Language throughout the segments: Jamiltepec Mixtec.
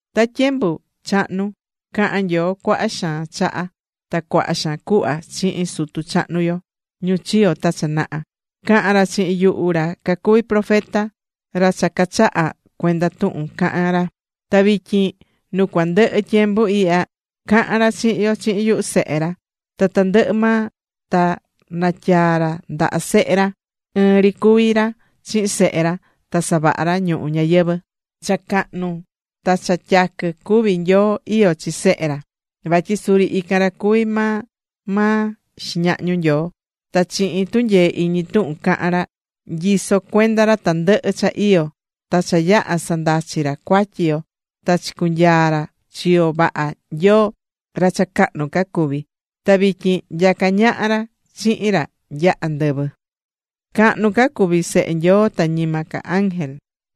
Ta tyembu chahnu caha̱n Nyoo cuaha xaan chaha, ta cuaha xaan cuhva, chihin sutu chahnu yo, ñu chiyo̱ ta cha naha. Caha̱n ra chihin yuhu ra cacuvi̱ profeta, ra cha cachaha̱ cuenda tuhun cahán ra. Ta vityin nu cua ndɨhɨ tyembu ihya, cahán ra chihin yo chihin yuhu Sehe ra. Ta tandɨhɨ maa ta natyaa̱ ra ndaha Sehe ra. Ɨɨn ri cuví ra chihin Sehe ra ta savaha̱ ra ñuhu ñayɨvɨ̱. Cha cahnu ta cha tyaquɨ cuví Nyoo iyó chi Sehe ra, vatyi suri ican ra cuví maa maa xiñahñu Nyoo. Ta chihin tunyee iñi tuhun cahán ra, nyisó cuenda ra tandɨhɨ cha iyó. Ta cha yaha̱ sandachi̱ ra cuatyi yo, ta chicunyaa̱ ra chiyo vaha Nyoo, ra cha cahnu ca cuví. Ta vityin nyacá ñaha ra chihin ra nya andɨvɨ.Cahnu ca cuví Sehe Nyoo ta ñima ca ángel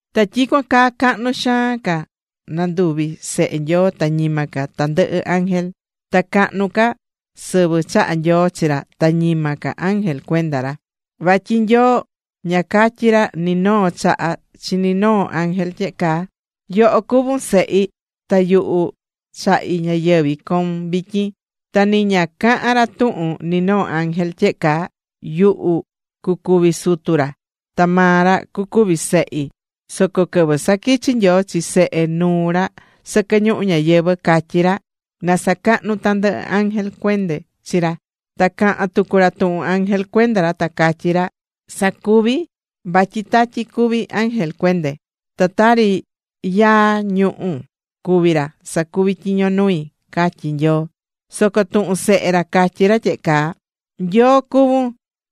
Ta tyicuan caa cahnu xaan ca nanduvi̱ Sehe Nyoo ta ñima ca tandɨhɨ ángel. Ta cahnu ca sɨvɨ chaha̱ Nyoo chi ra ta ñima ca ángel cuenda ra. Vatyi Nyoo ña catyi̱ ra ni noo chaha chi ni noo ángel tyehe caa: Yoho cuvún Sehi. Ta yuhu chahí ñayɨvɨ̱ coun vityín. Ta ni ña caha̱n ra tuhun ni noo ángel tyehe caa: Yuhu cucuvi Sutu ra. Ta maa ra cucuvi Sehi. Soco quɨvɨ saquichi̱ Nyoo chi Sehe nuu ra sɨquɨ ñuhu ñayɨvɨ, catyí ra: Na sacahnu tandɨhɨ ángel cuende chi ra. Ta caha̱n tucu ra tuhun ángel cuenda ra ta catyí ra: Sacuví vatyi tatyi cuví ángel cuende, ta tari yaa ñuhu̱ cuví ra sacuví tyiño nui, catyí Nyoo. Soco tuhun Sehe ra catyí ra tyehe caa: Nyoo cuvún,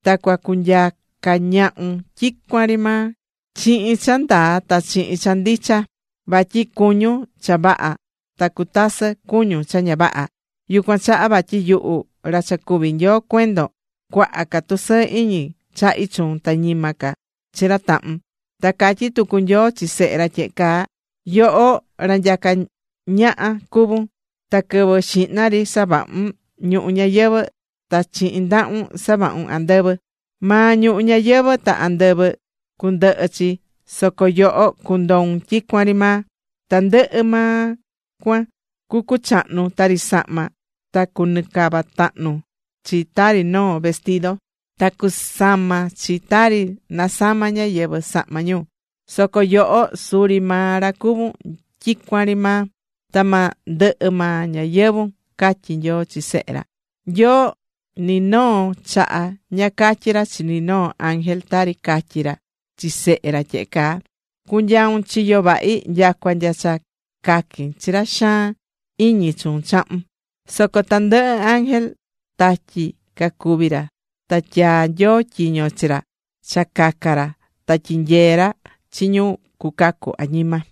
ta cua cunyaca ñahun tyicuan ri maa chihin cha ndaa ta chihin cha ndicha. Vatyi cuñún cha vaha ta cutasɨ cuñún cha ña vaha. Yucuan chaha vatyi yuhu, ra cha cuví Nyoo cuendon, cuaha ca tusɨɨ iñi chahí chuun, ta ñima ca chi ra tahun. Ta catyí tucu Nyoo chi Sehe ra tyehe caa: Yoho, ra nyacá ñaha cuvún. Ta quɨvɨ xihna ri savahu̱n ñuhu ñayɨvɨ̱ ta chihin ndahun savahu̱n andɨvɨ. Maa ñuhu ñayɨvɨ̱ ta andɨvɨ cundɨhɨ chi, soco yoho, cundoun tyicuan ri maa. Tandɨhɨ maa cuan cu cuchahnu tari sahma. Ta cunɨcava tahnu chi tari noo vestido. Ta cunasama chi tari nasamá ñáyɨvɨ sahma ñu. Soco yoho suri maa ra cuvún tyicuan ri maa. Ta ma ndɨhɨ maa ñayɨvu̱n, catyí Nyoo chi Sehe ra. Nyoo ni noo chaha ña catyí ra chi ni noo ángel tari catyí ra chi Sehe ra tyehe caa: Cu̱nyaun chiyo vahi nyacua nya cha caquin chi ra xaan iñi chuun chahun. Soco tandɨhɨ ángel, tatyi cacuví ra ta tyaa̱ Nyoo tyiño chi ra cha caca ra ta tyinyee ra chi ñu cucacu añima.